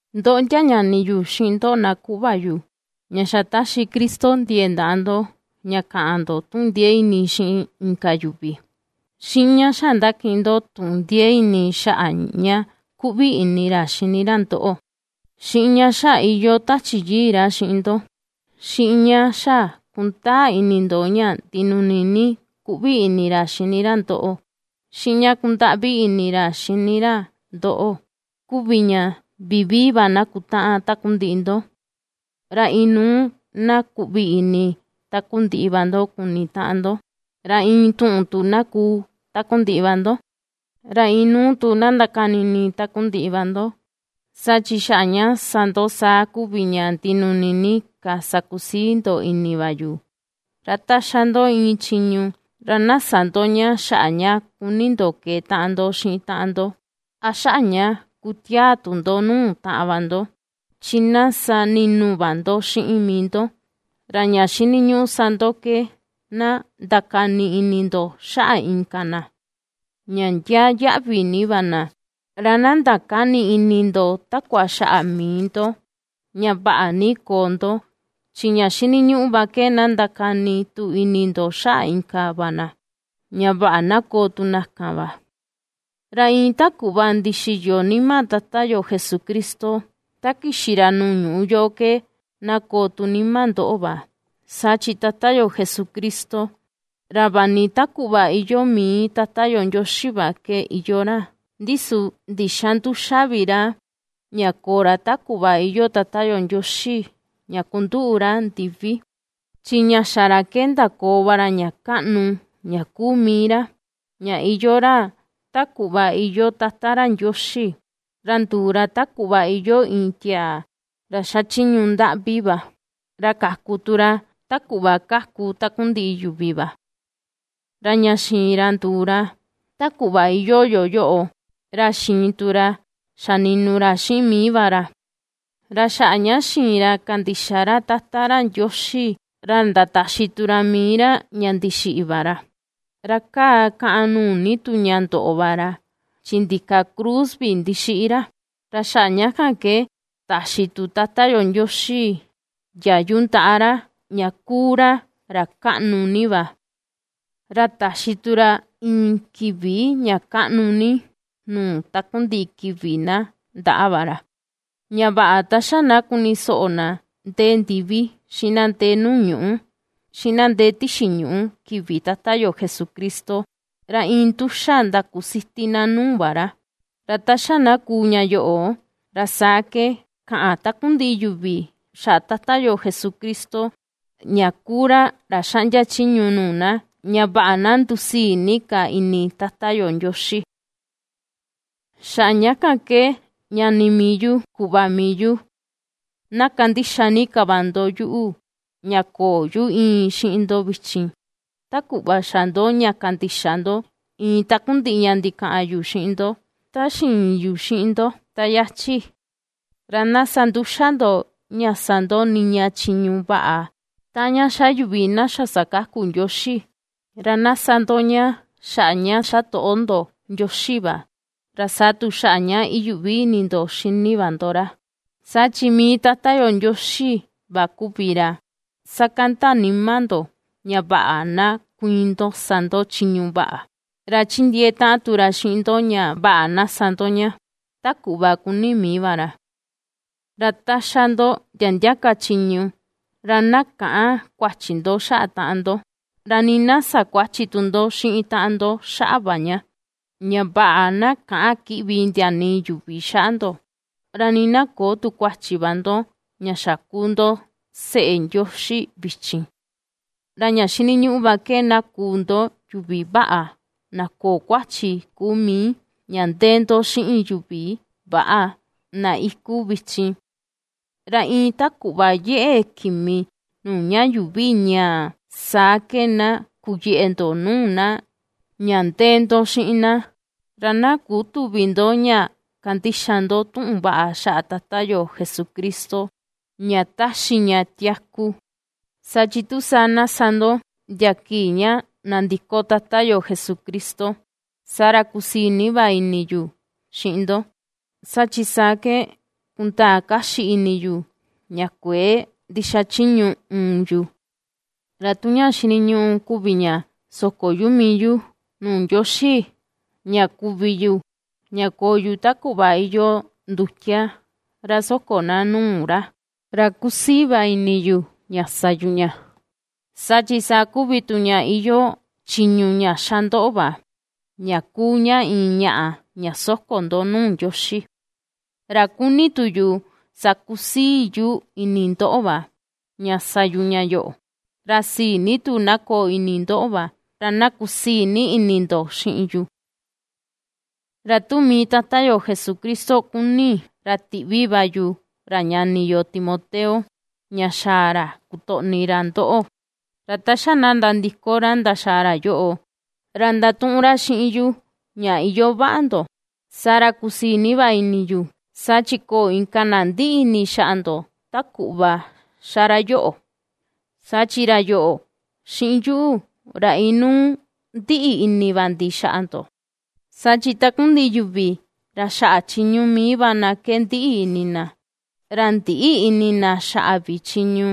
Ndoꞌo ndia ñani yu, xiꞌin ndoꞌo na kuꞌva yu, ña xa ^taxi Cristo ndiee ndaꞌa ndo ña kaꞌan ndo tuꞌun ndiee ini xiꞌin inka yuvi, xiꞌin ña xa ^ndakiꞌin ndo tuꞌun ndiee ini xaꞌa ña kuꞌvi ini ra xini ra ndoꞌo, xiꞌin ña xa iyoo Tachi Yii ra xiꞌin ndo, xiꞌin ña xa kundaa ini ndo ña ndinuni ni kuꞌvi ini ra xini ra ndoꞌo, xiꞌin ña kundaꞌvi ni ini ra xini ra ndoꞌo, kuvi ña vivii va na kutaꞌan takundiꞌi ndo, ra inuu na kuꞌvi ini takundiꞌi va ndo kuni taꞌan ndo, ra iin tuꞌun tu na kuu takundiꞌi va ndo, ra inuu tu na ndakani ini takundiꞌi va ndo, saa chi xaꞌa ña sa ndo saa kuvi ña ndinuni ni ka sakusii ndo ini va yu. Ra ta ^xa ndo iin chiñu, ra na sä ndo ña xaꞌa ña kuni ndo keetaꞌan ndo xiꞌin taꞌan ndo, a xaꞌa ña kutiaa tu ndo nuu taꞌan va ndo, chi na sa ni̱nu̱ va ndo xiꞌin mii ndo, ra ña xiniñuꞌu sa ndo ke na ndakani ini ndo xaꞌa inka na ña ndiaa yaꞌvi ni va na. Ra na ndakäni ini ndo takua xaꞌa mii ndo, ña vaꞌa ni koo ndo, chi ña xiniñuꞌu va ke na ndakani tu ini ndo xaꞌa inka va na, ña vaꞌa na koo tu na kan va. Ra iin ta kuꞌva ndixiyo nima Tata yo Jesucristo, ta kixi ra nuu ñuꞌu yoꞌo ke na koo tu nima ndoꞌo va. Saa chi Tata yo Jesucristo, ra vaꞌa ni ta kuꞌva iyoo mii Tata yo Ndioxi va iyoo ra, ndi su ndïxa nduxa vi ra ña koo ra ta kuꞌva iyoo Tata ra Ndioxi, ña kunduꞌu ra ndivi, chi ña xa ra ke, ndakoo va ra ña kaꞌnu ña kuu mii ra, ña iyoo ra ta kuꞌva iyoo Tata ra Ndioxi, ra nduu ra ta kuꞌva iyoo iin tiaa ra xachiñu ndaꞌvi va, ra kaku tu ra, ta kuꞌva ^kaku takundiꞌi yuvi va. Ra ña xiin ra nduu ra, ta kuꞌva iyoo yo, ra xiin tu ra xa ni̱nu̱ ra xiꞌin mii va ra, ra xaꞌa ña xiin ra kandixa ra Tata ra Ndioxi, ra ndataxi tu ra mii ra, ña ndixiꞌi va ra, ra kaa kàꞌàn nuu ni tu ña ndoꞌo va ra, chi ndika cruz vi ndixiꞌi ra, ra xaꞌa ña kan ke taxi tu Tata yo Ndioxi ndiayu ndaꞌa ra, ña ^kuu ra, ra kaꞌnu ni va, ra taxi ra iin kivi ña kaꞌnu nuu takundiꞌi kivi na, ndaꞌa va ra. Ña vaꞌa ta xa na kuni soꞌo na ndee ndivi, xiꞌin na ndee nuu ñuꞌu, xiꞌin na ndee tixi ñuꞌu kivi Tata yo Jesucristo, ra iin nduxa ndakusiti na nuu va ra, ra ta xa na kuu ña yoꞌo, ra saa ke kaꞌan takundiꞌi yuvi xaꞌa Tata yo Jesucristo, ña kuu ra, ra xaꞌndia chiñu nuu na, ña vaꞌa na ndusii ni ka ini Tata yo Ndioxi. Xaꞌa ña kan ke ñani mii yu, kuꞌva mii yu, na ^kandixa ni ka va ndo yuꞌu ña köo yu íin xiꞌin ndo vichin, ta kuꞌva xa ndo ña kandixa ndo iin takundiꞌi ña ndikaꞌan yu xiꞌin ndo, ta ndixiin yu xiꞌin ndo, ta yachi. Ra na sa nduxa ndo ña sa ndo niña chiñu vaꞌa, taꞌan ña ^xa yuvi na xa sakaku Ndioxi. Ra na sa ndo ña xaꞌa ña xa toꞌo ndo Ndioxi va, ra saa tu xaꞌa ña iyuꞌvi ini ndo xini va ndo ra. Saa chi mii Tata yo Ndioxi va kuvi ra ^sakanda nima ndo, ña vaꞌa na kuiin ndo sa ndo chiñu vaꞌa, ra ^chindiee taꞌan tu ra xiꞌin ndo, ña vaꞌa na sa ndo ña, ta kuꞌva kuni mii va ra. Ra ta ^xa ndo ndia ndia ka chiñu, ra na käꞌan kuachi ndo xaꞌa taꞌan ndo, ra nii na sä kuachi tu ndo xiꞌin taꞌan ndo xaꞌa va ña, ña vaꞌa na käꞌan kiꞌvi ndia nii yuvi xaꞌa ndo, ra nii na köo tu kuachi va ndo, ña xa kuu ndo seꞌe Ndioxi vichin, ra ña xiniñuꞌu va ke na kuu ndo yuvi vaꞌa na köo kuachi kuu mii, ña ndee ndo xiꞌin yuvi väꞌa na iku vichin. Ra iin ta kuꞌva yeꞌe kimi nuu ña yuuvi ñaa, saa ke, na kuyeꞌe ndo nuu na ña ndee ndo xiꞌin na. Ra na kutüvi ndo ña kandixa ndo tuꞌun vaꞌa xaꞌa Tata yo Jesucristo, ña taxi ña tiaku. Saa chi tu saa, na sa ndo ndia kii ña nandiko Tata yo Jesucristo, saa ra kusii ni va ini yu xiꞌin ndo, saa chi saa ke kundaa kaxi ini yu ña kuëe ndixachiñu uun yu. Ra tu ña xiniñuꞌu kuvi ña soko yu mii yu nuu Ndioxi, ña kuvi yu, ña koo yu, ta kuꞌva iyoo ndutia ra soko na nuu ra, ra kusii va ini yu ña sa yu ña, saa chi saa kuvi tu ña iyoo chiñu ña xa ndoꞌo va ña kuu ña iin ñaꞌa ña soko ndo nuu Ndioxi. Ra kuni tu yu sakusii yu ini ndoꞌo va ña sa yu ña yoꞌo. Ra sii ni tu na koo ini ndoꞌo va, ra na kusii ini ndo xiꞌin yu. Ra tu mii Tata yo Jesucristo kuni, ra tiꞌvi va yu ra ñani yo Timoteo ña xaa ra kutoꞌni ra ndoꞌo, ra ta xa na nandiko ra ndaxaa ra yoꞌo, ra ndatuꞌun ra xiꞌin yu ña iyoo vaꞌa ndo, saa ra kusii ni va ini yu. Saa chi köo inka na ndiꞌi ini xaꞌa ndo, ta kuꞌva xa ra yoꞌo, saa chi ra yoꞌo, xiꞌin yuꞌu, ra inuu ndiꞌi ini va ndi xaꞌa ndo. Saa chi takundiꞌi yuvi, ra xaꞌa chiñu mii va na ke ndiꞌi ni ini na, ra ndïꞌi ini na xaꞌa vi chiñu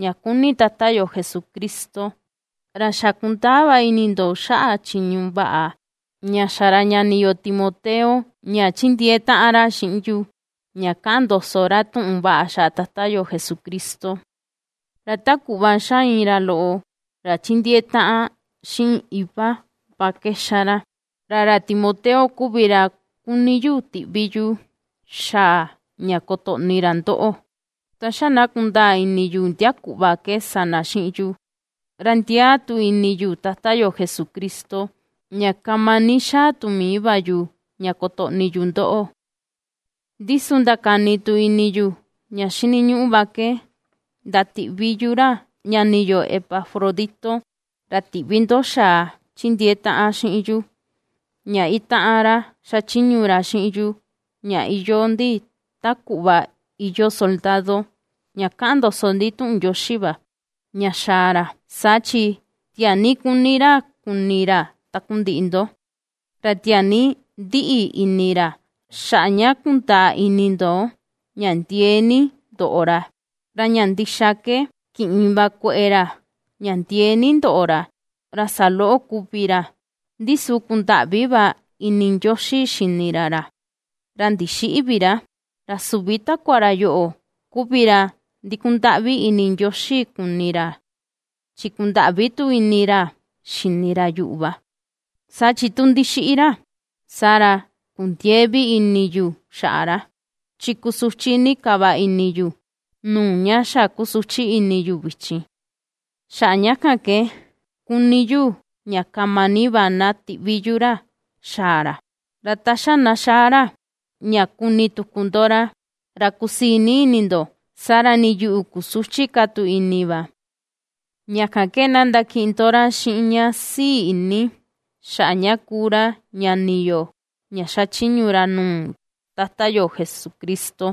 ña kuni Tata yo Jesucristo. Ra xa̱ kundaa va ini ndo, xaꞌa chiñu vaꞌa ña xa ra ñani yo Timoteo ña ^chindiee taꞌan ra xiꞌin yu ña kaꞌan ndoso ra tuꞌun vaꞌa xaꞌa Tata yo Jesucristo, ra ta kuꞌva ^xa iin ra loꞌo, ra chindiee taꞌan xiꞌin iva va ke ^xa ra. Ra ra Timoteo, kuvi ra kuni yu tiꞌvi yu xaa ña kotoꞌni ra ndoꞌo, ta xa na kundaa ini yu ndia kuꞌva ke sa na xiꞌin yu; ra ndiaa tu ini yu Tata yo Jesucristo, ña kama ni xaa tu mii va yu, ña kotoꞌni yu ndoꞌo. Ndi su ndakani tu ini yu ña xiniñuꞌu va ke ndatiꞌvi yu ra ñani yo Epafrodito, ra tiꞌvi ndo xa̱à ^chindiee taꞌan xiꞌin yu, ña itaꞌan ra xachiñu ra xiꞌin yu, ña iyoo ndi ta kuꞌva iyoo soldado, ña kaꞌan ndoso ndi tuꞌun Ndioxi va, ña xa̱a̱ ra. Saa chi tiaa ni ^kuni ra kuni ra takundiꞌi ndo, ra tiaa ni ndiꞌi ini ra, xaꞌa ña kundaa ini ndo ña ndiee ni ndoꞌo ra. Ra ña ndixa ke ki̱ꞌin va kueꞌe ra ña ndiee ni ndoꞌo ra, ra saloꞌo kuvi ra; ndi su kundaꞌvi va ini Ndioxi xini ra ra, ra ndixïꞌi vi ra. Ra süvi takua ra yoꞌo, kuvi ra ndikundaꞌvi ini Ndioxi kuni ra, chi kundaꞌvi tu ini ra xini ra yuꞌu va, saa chi tu ndixiꞌi ra, saa ra kundiëe vi ini yu xaꞌa ra, chi kusuchi ni ka va ini yu, nuu ña xa kusuchi ni yu vichin. Xaꞌa ña kan ke kuni yu, ña kama ni va na tiꞌvi yu ra xaa ra. Ra ta xa na xaa ra, ña kuni tuku ndo ra, ra kusii ni ini ndo, saa ra nii yuꞌu, kusüchi ka tu ini va. Ña kan ke na ndakiꞌin ndo ra xiꞌin ña sii ini, xaꞌa ña kuu ra ñani yo ña xachiñu ra nuu Tata yo Jesucristo,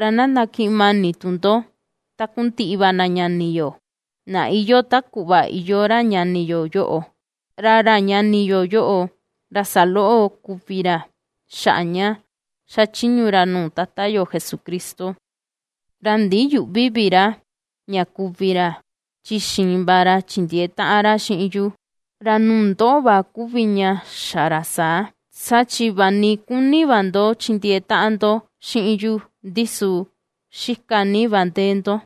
ra na ndakiꞌin mani tu ndo takundiꞌi va na ñani yo, na iyoo ta kuꞌva iyoo ra ñani yo yoꞌo; Ra ra ñani yo yoꞌo, ra saloꞌo kuvi ra xaꞌa ña xachiñu ra nuu Tata yo Jesucristo. Ra ndiyüꞌvi vi ra ña kuvi ra, chi xiin va ra chindiee taꞌan ra xiꞌin yu, ra nuu ndoꞌo va kuvi ña xa ra saa, saa chi vaꞌa ni kuni va ndo chindiee taꞌan ndo xiꞌin yu ndi su xika ni va ndee ndo.